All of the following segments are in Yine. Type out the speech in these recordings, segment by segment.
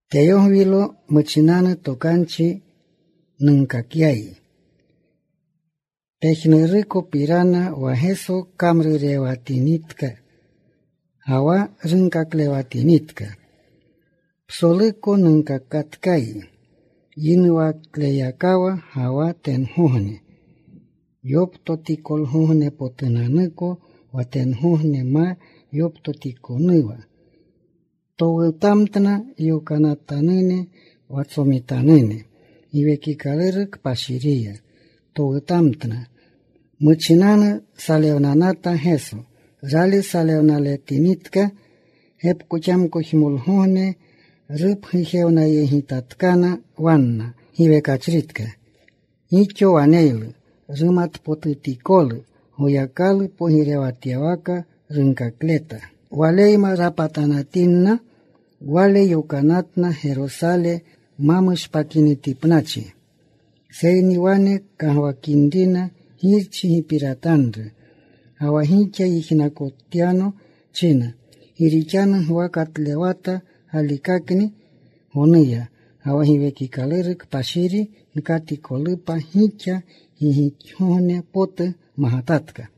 Teyogwilo, muchinanu tokanchi nunkakyayi pejnurukopirana wa Geso kamrurewatinitka ga wa runkaklewatinitka. Psoluko nunkakatkayi yinuwakleyakawa ga wa tengogne yoptotikolgognepotunanuko. Wa tengogne ma yoptotikonuwa towutamtna yokanatanune wa tsomitanune. Giwekikaluru Kpashiriya towutamtna. Muchinanu salewnanata Geso. Rali salewnaletinitka, gepkoxamkojmolgogne rupgujewnayegitatkana wanna giwekachritka. Gixo waneylu rumatpotutikolu. Goyakalu pogirewatyawaka runkakleta. Waleyma rapatanatinna, Wale yokanatna Gerosale ma mushpakinitipnachi, seyni wane kagwakinrina Girchi gipiratanru “wa gixa yijnakotyano,” china, “Gi rixanu Gwa katlewata galikakni gonuya, ga wa Giwekikaluru Kpashiri gkatikolupa gixa. Gi gixogogne potu magatatka.”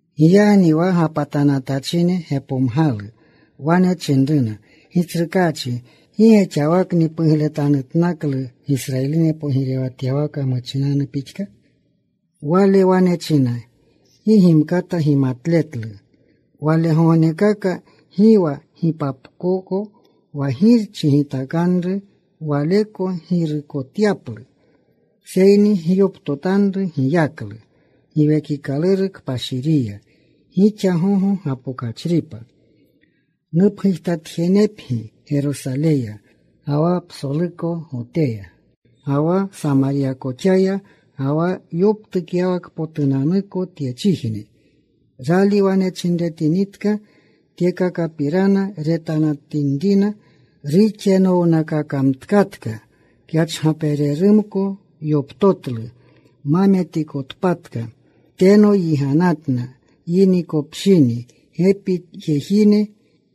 Giyagni wa gapatanatachine gepomgalu. Wane chinruna, “Gitsrukaachi, ¿gi ge xawakni pugletanutnaklu Gisrayiline pogirewatyawaka muchinanu pixka?” Wale wane chinna, “Gi gimkata gimatletlu walegognekaka, gi wa gipapkoko wa Girchi gitakanru Waleko girukotyaplu. Seyni gyoptotanru giyaklu Giwekikaluru Kpashiriya, gixa gogo gapokachripa. Nupgujtatjenepgi Gerosaleya, ga wa psoluko Goteya, ga wa Samaryakoxaya, ga wa yoptukyawakpotunanuko tyechijne.” Rali wane chinretinitka tyekakapirana, retanatinrina ruxenownakakamtkatka. Kyachgapererumko yoptotlu ma metikotpatka. Teno yiganatna yinikopshini. Gepi jejine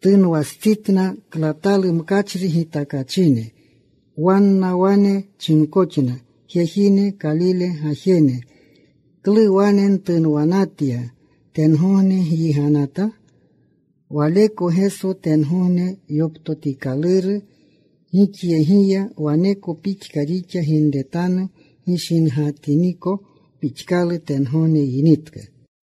tunwastsitna, klatalu mkachri gitakachine. Wanna wane chinkoxna, “Jejine, Kalile gajene, ¿klu wane ntunwanatya, tengogne gyiganata? Waleko Geso tengogne yoptotikaluru gixyegiya, waneko pixka rixa ginretanu gishingatiniko pixkalu tengogne yinitka.”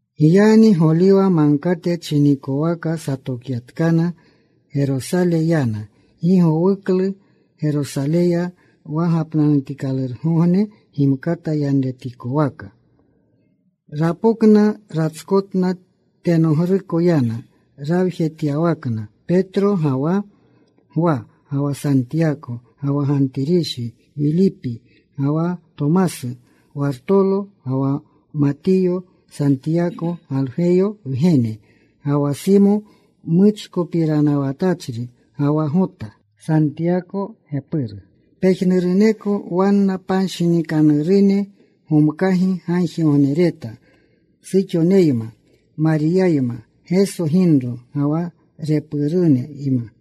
Giyagni Goliwa Magkate chinikowaka satokyatkana. Gerosale yana. Gi gowuklu Gerosaleya, wa gapnanutikalurgogne gimkata yanretikowaka. Rapokna. Ratskotna. Tenogruko yana, rawjetyawakna Petro, ga wa Gwa, ga wa Santiyako, ga wa Gantirishi; Wilipi ga wa Tomasu; Wartolo ga wa Matiyo; Santiyako, Galgweyo wgene, ga wa Simo Muchkopiranawatachri, ga wa Gota, Santiyako gepuru. Pejnuruneko wanna panshinikanerune gomkagi gagjigognereta, suxoneyma, Mariyayma Geso ginro, ga wa repuruneyma.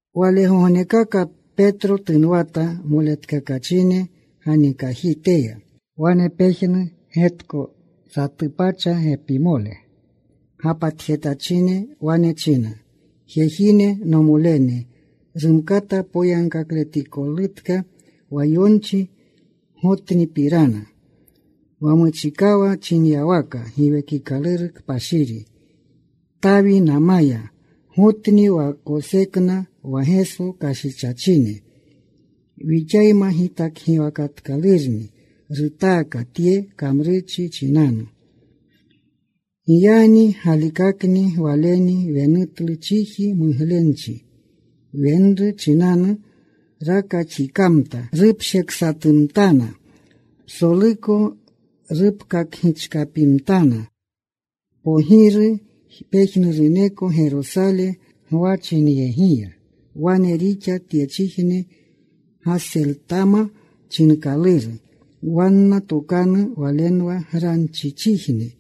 Walegognekaka Petro tunwata moletkakachine ganikajiteya. Wane pejnu getko: satu pacha gepimole gapatjetachine. Wane china, “Jejine, nomolene, rumkata poyagkakletikolutka wa yonchi Gotnipirana, wa muchikawa chinyawaka Giwekikaluru Kpashiri Tawinamaya. Gotni wa kosekna wa Geso kashichachine. Wixayma gitakgiwakatkalurni. Rutaaka tye kamrurchi chinanu. “Giyagni galikakni waleni wenutlu chiji muglenchi wenru chinanu. Rakaxikamta. Rupsheksatumtana. Psoluko rupkakgichkapimtana. Kpoginru pejnuruneko Gerosale gwachinyegiya. Wane rixa tyechijne Gaseltama chinkaluru wanna tokanuya. Walenwa Granchichijne.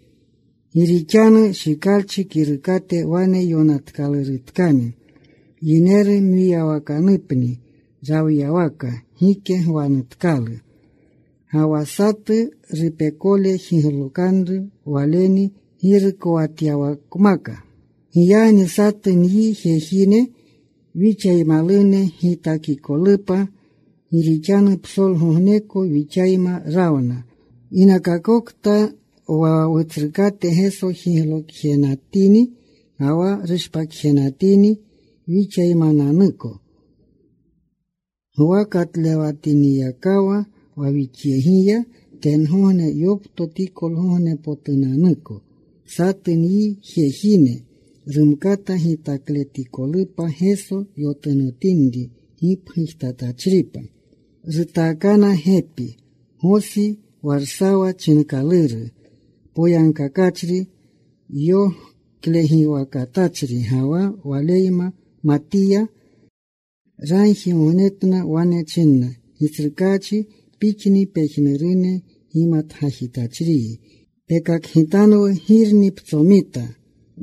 Gi rixanu Shikalchi Kirukate wane yonatkalurutkani: Yineru mwiyawakanupni rawyawaka. Gike gwanutkalu. Ga wa: Satu rupekole jiglokanru waleni girukowatyawakmaka. “Giyagni satu nyi jejine wixaymalune gitakikolupa, gi rixanu psolgogneko wixayma rawna ginakakokta wa Wutsrukate Geso jiglokjenatini ga wa rushpakjenatini wixaymananuko. Gwa katlewatiniyakawa wa wixyegiya tengogne yoptotikolgognepotunanuko. Satu nyi jejine rumkata gitakletikolupa Geso yotunotinri gipgujtatachripa.” Rutaakana gepi: Gosi, Warsawa chinkaluru, Poyagkakachri yoklegiwakatachri, ga wa waleyma Matiya. Ragjigognetna. Wane chinna, “Gitsrukaachi, Pixni pejnurune gimatgajitachriyi. Pekakgitanwu girni ptsomita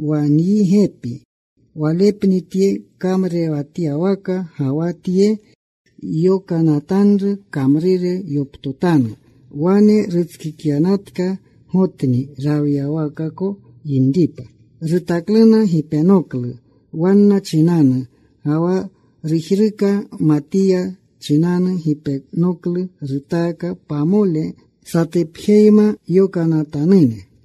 wa nyi gepi. Walepni tye kamrurewatyawaka ga wa tye yokanatanru kamrure yoptotanu. Wane rutskikyanatka Gotni rawyawakako yinripa.” Rutakluna gipenoklu wanna chinanu, ga wa rujruka Matiya chinanu gipenoklu. Rutaaka pamole satupjeyma yokanatanune.